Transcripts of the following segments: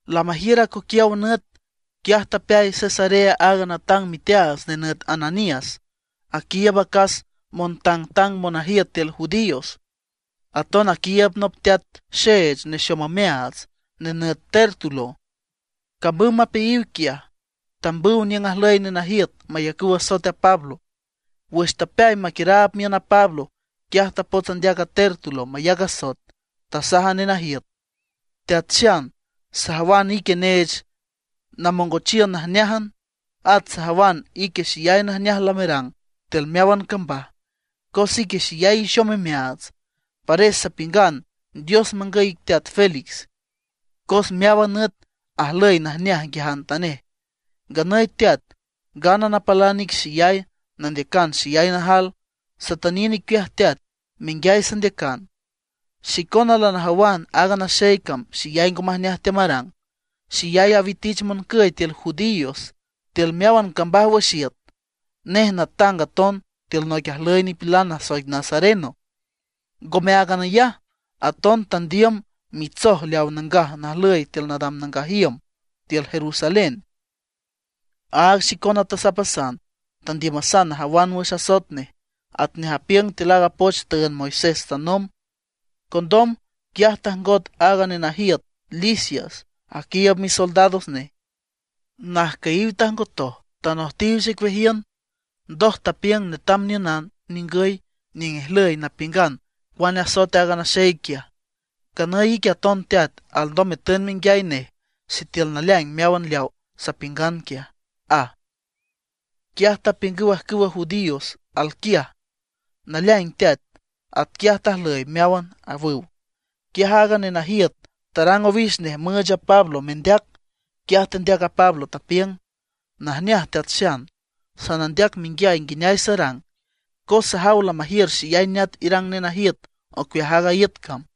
Lamajiür acoquiaw nüt, quiaj tapeay Cesarea aaga natang miteaats nenüt Ananías, aquiiüb acas montangtang monajiüt tiül judíos. Aton aquiiüb nop teat xeech nexom omeaats, nenüt Tértulo. Camüm mapeayiw quiaj, tambüw niüng ajlüy nenajiüt mayacüw asoet a Pablo. Wüx tapeay maquiüraab miün a Pablo, quiaj tapots andeac a Tértulo mayac asoet. Tasaj a nenajiüt: ―Teat xan, sajawan ique neech namongochiün najneájan; at sajawan ique xeyay najneaj lamerang tiül meáwan cambaj, cos ique xeyay ixom imeaats. Pares sapiüngan Dios mangüy ic teat Félix, cos meáwan nüt ajlüy najneaj nguiajantanej. Nganüy teat, ngana napalan ic xeyay, nandeac xeyay najal, satüniün icueaj teat, menguiay sandeacan. Xicona lanajawan aaga naxey cam, xeyay ngo majneaj teamarang, xeyay awitich moncüy tiül judíos tiül meáwan cambaj wüx iüt. Nej natang aton tiül noic ajlüy nipilan nasoic nazareno. Ngome áagan ayaj, aton tandiüm mitsoj leaw nangaj najlüy tiül nadam nangaj iüm tiül Jerusalén. Áag xicona tasapasan, tandiümasan najawan wüx asoet nej, atnej apiüng tiül aaga poch tüünd Moisés tanomb. Condom, quiaj tajngot a nenajiüt Lisias aquiiüb misoldados nej, najcüyiw tajngotoj tanojtiw xicueajiün. Ndoj, tapiüng netam niünan ningüy niüng ijlüy napiüngan cuane asoet aaga naxey quiaj. Nganüy ique aton teat, alndom metün menguiay nej sitiül naleaing meáwan leaw sapiüngan quiaj ―aj. Quiaj tapiüngüw ajcüwa judíos alquiaj: ―Naleaing teat, atquiaj tajlüy meáwan ―awüw. Quiaj aaga nenajiüt tarang owix nej müüch a Pablo mendeac. Quiaj tendeac a Pablo, tapiüng: ―Najneaj teat xan, sanandeac menguiay nguineay sarang, cos sajaw lamajiür xeyay neat irang nenajiüt ocueaj aaga iüt cam.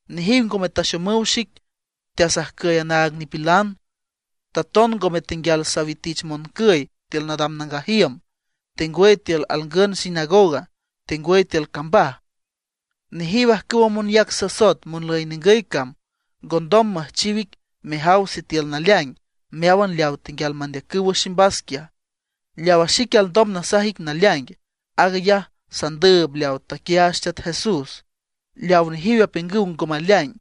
Nejiw ngome taxomüw xic teasajcüy anaag nipilan; taton ngome tenguial sawitich moncüy tiül nadam nangaj iüm, tengwüy tiül alngün sinagoga, tengwüy tiül cambaj. Nejiw ajcüwa monyac sasoet monlüy ningüy cam, ngondom müjchiw ic mejaw sitiül naleaing meáwan leaw tenguial mandeacüw wüx ximbas quiaj. Leawa xique alndom nasaj ic naleaing, aag ayaj sandüüb leaw taquiaach Teat Jesús, leaw nejiw apiüngüw ngo maleaing.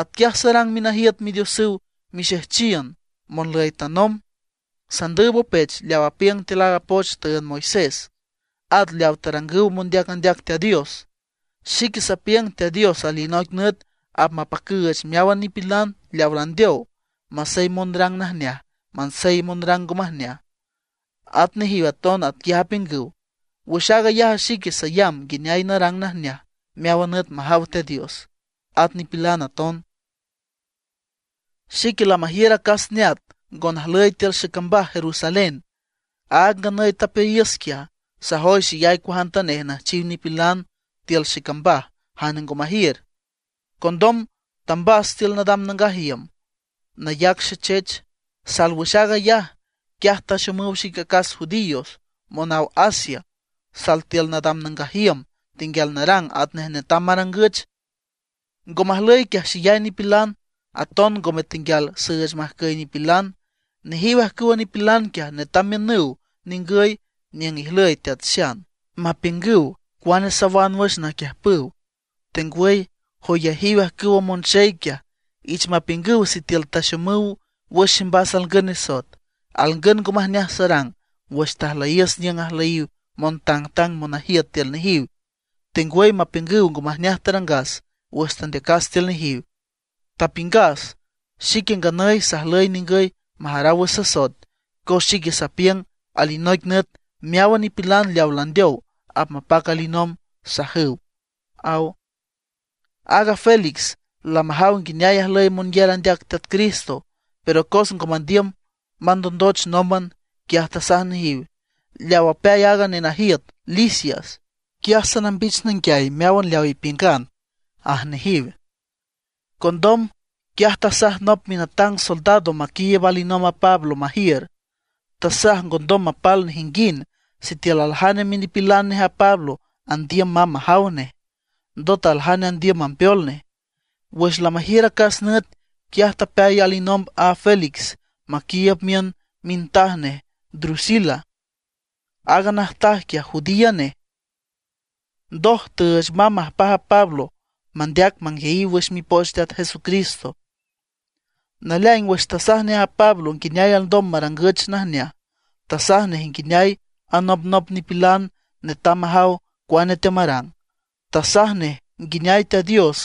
Atquiaj sarang minajiüt Midiosüw xexejchiün monlüy tanomb. Sandüüb opech leaw apiüng tiül a poch tüünd Moisés, at leaw tarangüw mondeac andeac Teat Dios. Xique sapiüng Teat Dios alinoic nüt apmapacüüch meáwan nipilan leaw landeow, masey monrang najneaj, masey monrang ngo majneaj. At nejiw aton atquiaj apiüngüw. Wüx aag ayaj a xique sayamb nguineay narang najneaj meáwan nüt majaw Teat Dios, at nipilan aton. ’Xique, lamajiür acas neat ngo najlüy tiül xecambaj Jerusalén, aag a nganüy tapeayiüs quiaj. Sajoy xeyay cuajantanej nüjchiw nipilan tiül xecambaj jane ngo majiür. Condom tambas tiül nadam nangaj iüm nayac xechech. Sal wüx aag ayaj, quiaj taxomüw xic acas judíos monaw Asia, sal tiül nadam nangaj iüm tenguial narang atnej netam marangüch. Ngo majlüy quiaj xeyay nipilan, aton ngome tenguial süüch majcüy nipilan. Nejiw ajcüwa nipilan quiaj netam miünüw ningüy niüng ijlüy teat xan, mapiüngüw cuane sawan wüx naquiüjpüw. Tengwüy joyajiw ajcüwa monxey quiaj, ich mapiüngüw sitiül taxomüw wüx ximbas alngün nisoet, alngün ngo majneaj sarang wüx tajlüyiüs niüng ajlüyiw montangtang monajiüt tiül nejiw. Tengwüy mapiüngüw ngo majneaj tarangas wüx tandeacas tiül nejiw. Tapiüngas: “Xique nganüy sajlüy ningüy majaraw wüx sasoet, cos xique sapiüng alinoic nüt meáwan nipilan leawa landeow apmapac alinomb”, sajüw ―aw. Aaga Félix lamajaw nguineay ajlüy monyar andeac Teat Cristo; pero cos ngo mandiüm mandondoch nómban, quiaj tasaj nejiw: ―Leaw apeay a nenajiüt Lisias, quiaj sanambich nanguiay meáwan leaw ipiüngan ―aj nejiw. Condom, quiaj tasaj nop minatang soldado maquiiüb alinomb a Pablo majiür. Tasaj ngondom mapal nejinguind, sitiül aljane minipilan nej a Pablo andiüm mamb majaw nej, ndot aljane andiüm mambeol nej. Wüx lamajiür acas nüt, quiaj tapeay alinomb a Félix maquiiüb miün mintaj nej Drusila. Aaga najtaj quiaj, judía nej. Ndoj tüüch mamb majpaj a Pablo mandeac manguiayiw wüx mipoch Teat Jesucristo. Naleaing wüx tasaj nej a Pablo nguineay alndom marangüch najneaj, tasaj nej nguineay anopnop nipilan netam majaw cuane teamarang. Tasaj nej nguineay Teat Dios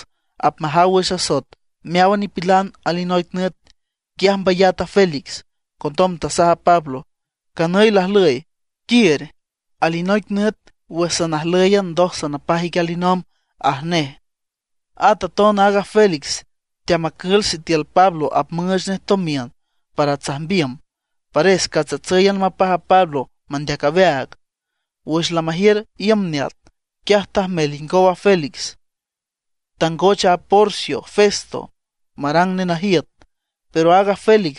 apmajaw wüx asoet meáwan nipilan alinoic nüt. Quiaj mbayat a Félix, condom tasaj a Pablo: ―Canüy lajlüy, quiür. Alinoic nüt wüx sanajlǘyan ndoj sanapaj ic alinomb ―aj nej. At aton aaga Félix teamacül sitiül Pablo apmüüch nej tomiün para tsajmbiüm. Pares catscatsǘyan mapaj a Pablo mandeac aweaag. Wüx lamajiür iüm neat, quiaj tajmel ingow a Félix, tangoch a Porcio Festo marang nenajiüt. Pero aaga Félix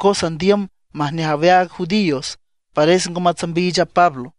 cos andiüm majneaj aweaag judíos, pares ngo matsambiich a Pablo.